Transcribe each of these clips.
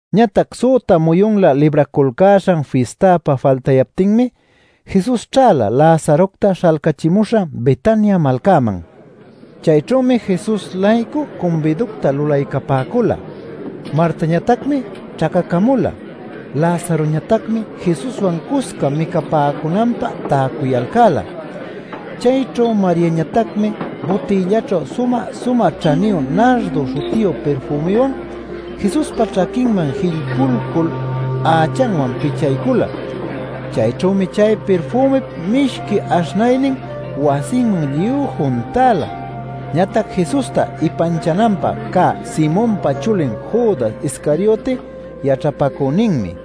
Ñatac süta muyunlä Libraculcäśhan Fistapä faltayaptinmi, Jesus ćhäla Lazarocta śhalcachimuśhan Betania malcaman. Chayćhümi Jesus-laycu cumbiducta lulaycapäcula. Martañatacmi ćhacacamula. Lazaroñatacmi Jesuswan cusca micapäcunanpä täcuyalcäla. Chayćhu Mariañatacmi butïllaćhu sumä-sumä ćhaniyu nardo śhutiyu pirfümiwan Jesuspa ćhaquinman jillpuycul ächanwan pichaycula. Chayćhümi chay pirfümip mishqui aśhnaynin wasinman lluy juntäla. Ñatac Jesusta ipanchananpä cä Simonpa chulin Judas Iscarioti yaćhapacüninmi: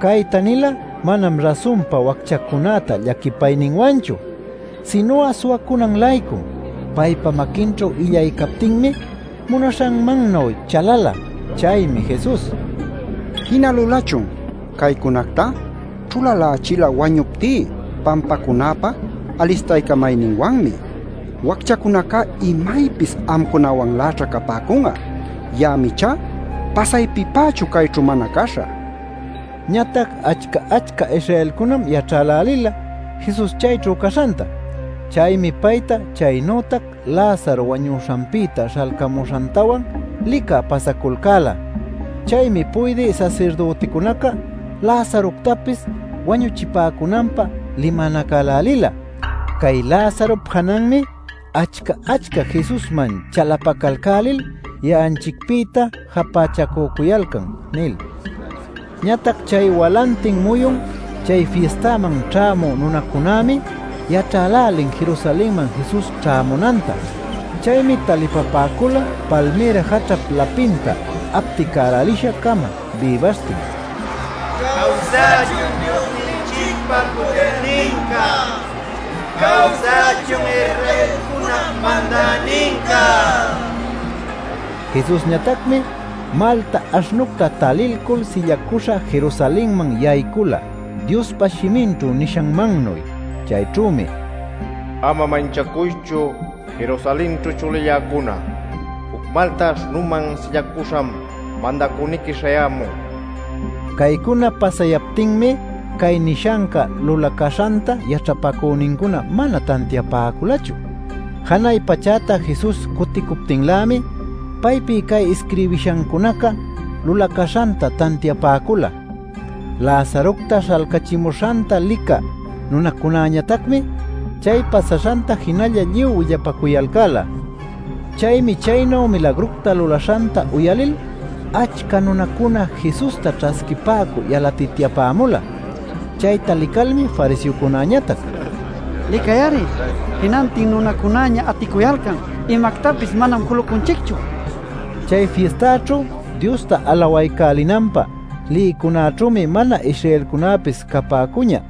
Cayta nila manam rasunpa wacchacunäta llaquipayninwanchu, sinu'a suwacunan-laycum. Paypa maquinćhu illay captinmi munalishanmannuy chalala. Chaymi Jesus: “Jina lulachun. Caycunactá ćhulalächila wañuptí pampacunäpä alistaycamayninwanmi. Wacchacunacá imaypis amcunawanläćha capäcun'a. Ya'am ichá pasaypipächu cayćhu mana caśhä” nin. Ñatac achca-achca Israelcunam yaćhälälila Jesus chayćhu caśhanta. Chaymi payta chaynütac Lazaro wañuśhanpïta śhalcamuśhantawan licä pasaculcäla. Chaymi puydï sasirdüticunaca Lazaroctapis wañuchipäcunanpä limanacälälila: “Cay Lazarop jananmi achca-achca Jesusman chalapacalcälil ya'anchicpïta japächacücuyalcan” nil. Ñatac chay walantin muyun chay fistaman ćhämü nunacunämi yaćhälälin Jerusalenman Jesus ćhämunanta. Chaymi talipapäcula palmïra jaćhap lapinta apticälälisha-cama bïbaśhtin: “¡Cawsachun Diosninchicpa pudirninca! ¡Cawsachun Israelcunap Mandäninca!” nil. Jesusñatacmi malta aśhnucta talilcul sillacuśha Jerusalenman yaycula Diospa shiminćhu nishanmannuy. Chayćhümi: “Ama manchacuychu, Jerusalenćhu chulilläcuna. Juc malta aśhnuman sillacüśham Mandacüniqui śhayämun” niyan. Caycuna pasayaptinmi cay nishanca lulacäśhanta yaćhapacünincuna mana tantiapäculachu. Janay pachäta Jesus cuticuptinlämi paypi cay isquirbishancunaca lulacäśhanta tantiapäcula. Lazarocta śhalcachimuśhanta licä nunacunäñatacmi chay pasaśhanta jinalla lluy willapacuyalcäla. Chaymi chaynu milagructa lulaśhanta uyalil achca nunacuna Jesusta ćhasquipäcü yalatityapämula. Chayta licalmi fariseocunäñatac: “¡Licay-ari! Jinantin nunacunäña aticuyalcan. Imactapis manam julucunchicchu” nipäcula. Chay fistaćhu Diosta alawaycälinanpä lïcunaćhümi mana-Israelcunäpis capäcuñä.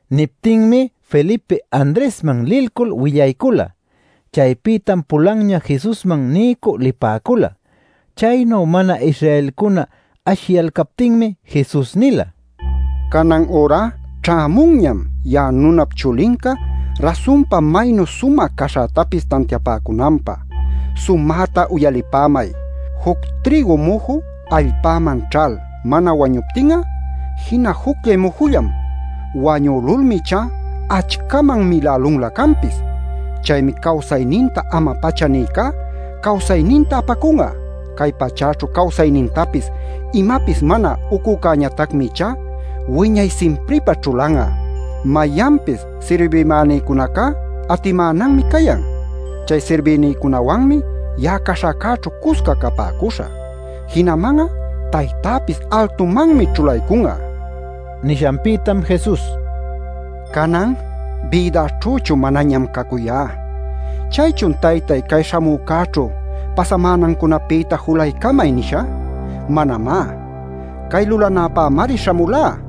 Niptinmi Felipe Andresman lilcul willaycula. Chaypïtam pulanña Jesusman niycü lipäcula. Chaynu mana-Israelcuna ashiyalcaptinmi Jesus nila: “Canan ürá ćhämunñam ya'a Nunap Chulinca rasunpa maynu sumä caśhätapis tantiapäcunanpä. Sumäta uyalipämay: juc trïgu muju allpäman ćhal mana wañuptin'a, jina jucllay mujullam. Wañülulmi ichá achcaman milälunlä canpis. Chaymi cawsayninta ama-pacha nïcá cawsayninta apacun'a. Cay pachäćhu cawsaynintapis imapis mana ucücäñatacmi ichá wiñay simpripä ćhulan'a. Mayanpis sirbïmänïcunacá atimänanmi cayan; chay sirbïnïcunawanmi ya'a caśhäcäćhu cusca capäcuśhä. Jinaman'a Taytäpis altumanmi ćhulaycun'a” nil. Nishanpïtam Jesus: “Canan bïdäćhüchu manañam cacuyá. ¿Chaychun ‘Taytay cay śhamücäćhu pasamänancunapïta julaycamay’ nishä? Manamá; cay lulanäpämari śhamulá.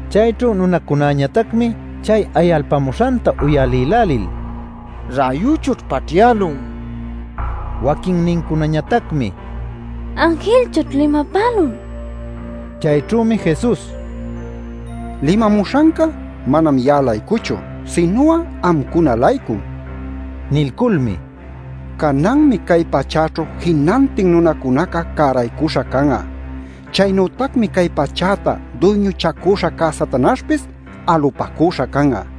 Chayćhu nunacunäñatacmi chay ayalpämuśhanta uyalïlälil: “Räyuchućh paćhyälun” nipäcun. Waquinnincunañatacmi “Anjilchućh limapälun” nipäcula. Chayćhümi Jesus: “Limamuśhanca manam ya'a-laycuchu, sinu'a amcuna-laycum” nin. Nilculmi: “Cananmi cay pachäćhu jinantin nunacunaca cäraycuśha can'a. Chaynütacmi cay pachäta duyñuchacüśha cä Satanaśhpis alupacüśha can'a.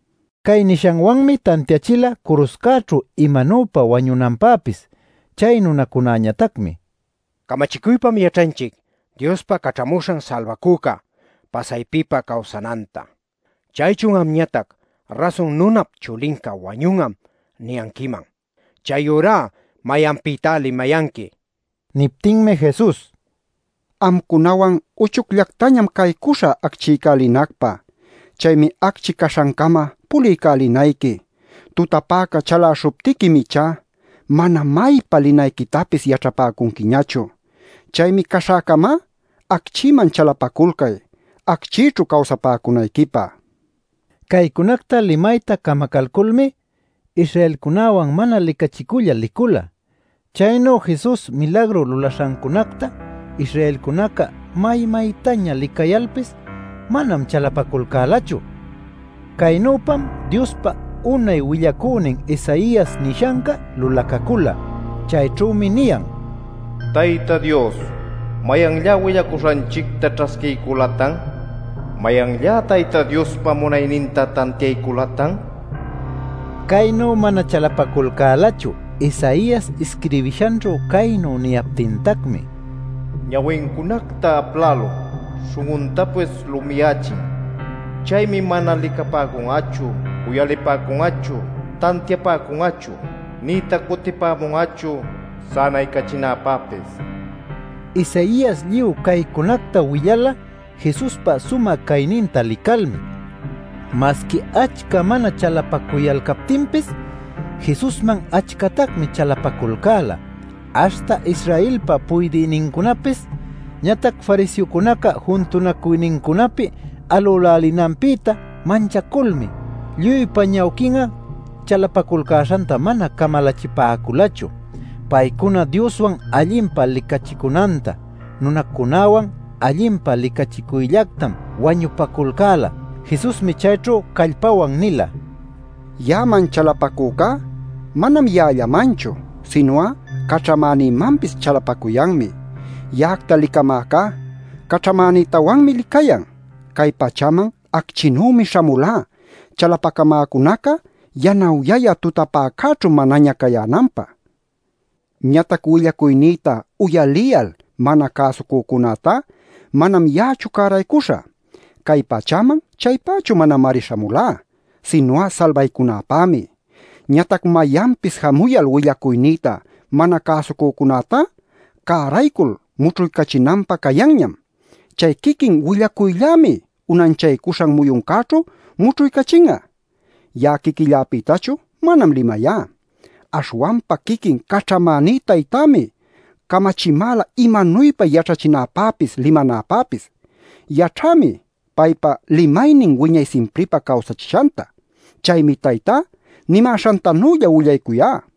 Cay nishanwanmi tantiachila curuśhcäćhu imanuypa wañunanpäpis. Chay nunacunäñatacmi: “Camachicuypam yaćhanchic Diospa Caćhamuśhan Salbacüca pasaypipä cawsananta. ¿Chaychun amñatac ‘Rasun Nunap Chulincá wañun'am’ niyanquiman? Chayurá ¿mayanpïtá limayanqui?” nicuyalcan. Niptinmi Jesus: “Amcunawan uchucllactañam caycuśhä acchiycälinacpä. Chaymi acchi caśhancama puliycälinayqui. Tutapäca chaläśhuptiquim ichá mana maypa linayquitapis yaćhapäcunquiñachu. Chaymi caśhäcamá acchïman chalapaculcay, acchïćhu cawsapäcunayquipä” nin. Caycunacta limayta camacalculmi Israelcunäwan mana licachicullal licula. Chaynu Jesus milagru lulaśhancunacta Israelcunaca may-maytaña licayalcalpis manam chalapaculcälachu. Caynüpam Diospa unay willacünin Isaias nishanca lulacacula. Chayćhümi niyan: “Tayta Dios ¿mayanllá willacuśhanchicta ćhasquiyculatan? ¿Mayanllá Tayta Diospa munayninta tantiayculatan?” nil. Caynu mana chalapaculcälachu Isaias isquirbishanćhu caynu niyaptintacmi: “Ñawincunacta aplälun, śhun'untapis lumiyächin. Chaymi mana licapäcun'achu, uyalipäcun'achu, tantiapäcun'achu, nïtac cutipämun'achu sänaycachinäpäpis” nil. Isaias lluy caycunacta willala Jesuspa sumä cayninta licalmi. Masqui achca mana chalapacuyalcaptinpis Jesusman achcatacmi chalapaculcäla aśhta Israelpa puydïnincunapis. Ñatac fariseocunaca juntunacuynincunapi alülälinanpïta manchaculmi lluypa ñawquin'a chalapaculcäśhanta mana camalachipäculachu. Paycuna Dioswan allinpa licachicunantá, nunacunäwan allinpa licachicuyllactam wañupaculcäla. Jesusmi chayćhu callapawan nila: “Ya'aman chalapacücá manam ya'allamanchu, sinu'a caćhamänïmanpis chalapacuyanmi. Ya'acta licamäcá caćhamänïtawanmi licayan. Cay pachäman acchinümi śhamulá chalapacamäcunaca yanawyayä tutapäcäćhu manaña cayänanpä. Ñatac willacuynïta uyaliyal mana cäsucücunätá manam ya'achu cäraycuśhä. Cay pachäman chaypächu manamari śhamulá, sinu'a salbaycunäpämi. Ñatac mayanpis jamuyal willacuynïta mana cäsucücunätá cäraycul mućhuycachinanpä cayanñam. Chay quiquin willacuyllämi unanchaycuśhan muyuncäćhu mućhuycachin'a. Ya'a quiquilläpïtachu manam limayá. Aśhwanpa quiquin caćhamäní Taytämi camachimäla imanuypa yaćhachinäpäpis limanäpäpis. Yaćhämi paypa limaynin wiñay simpripä cawsachishanta. Chaymi Taytá nimäśhantanülla willacuyá” nila.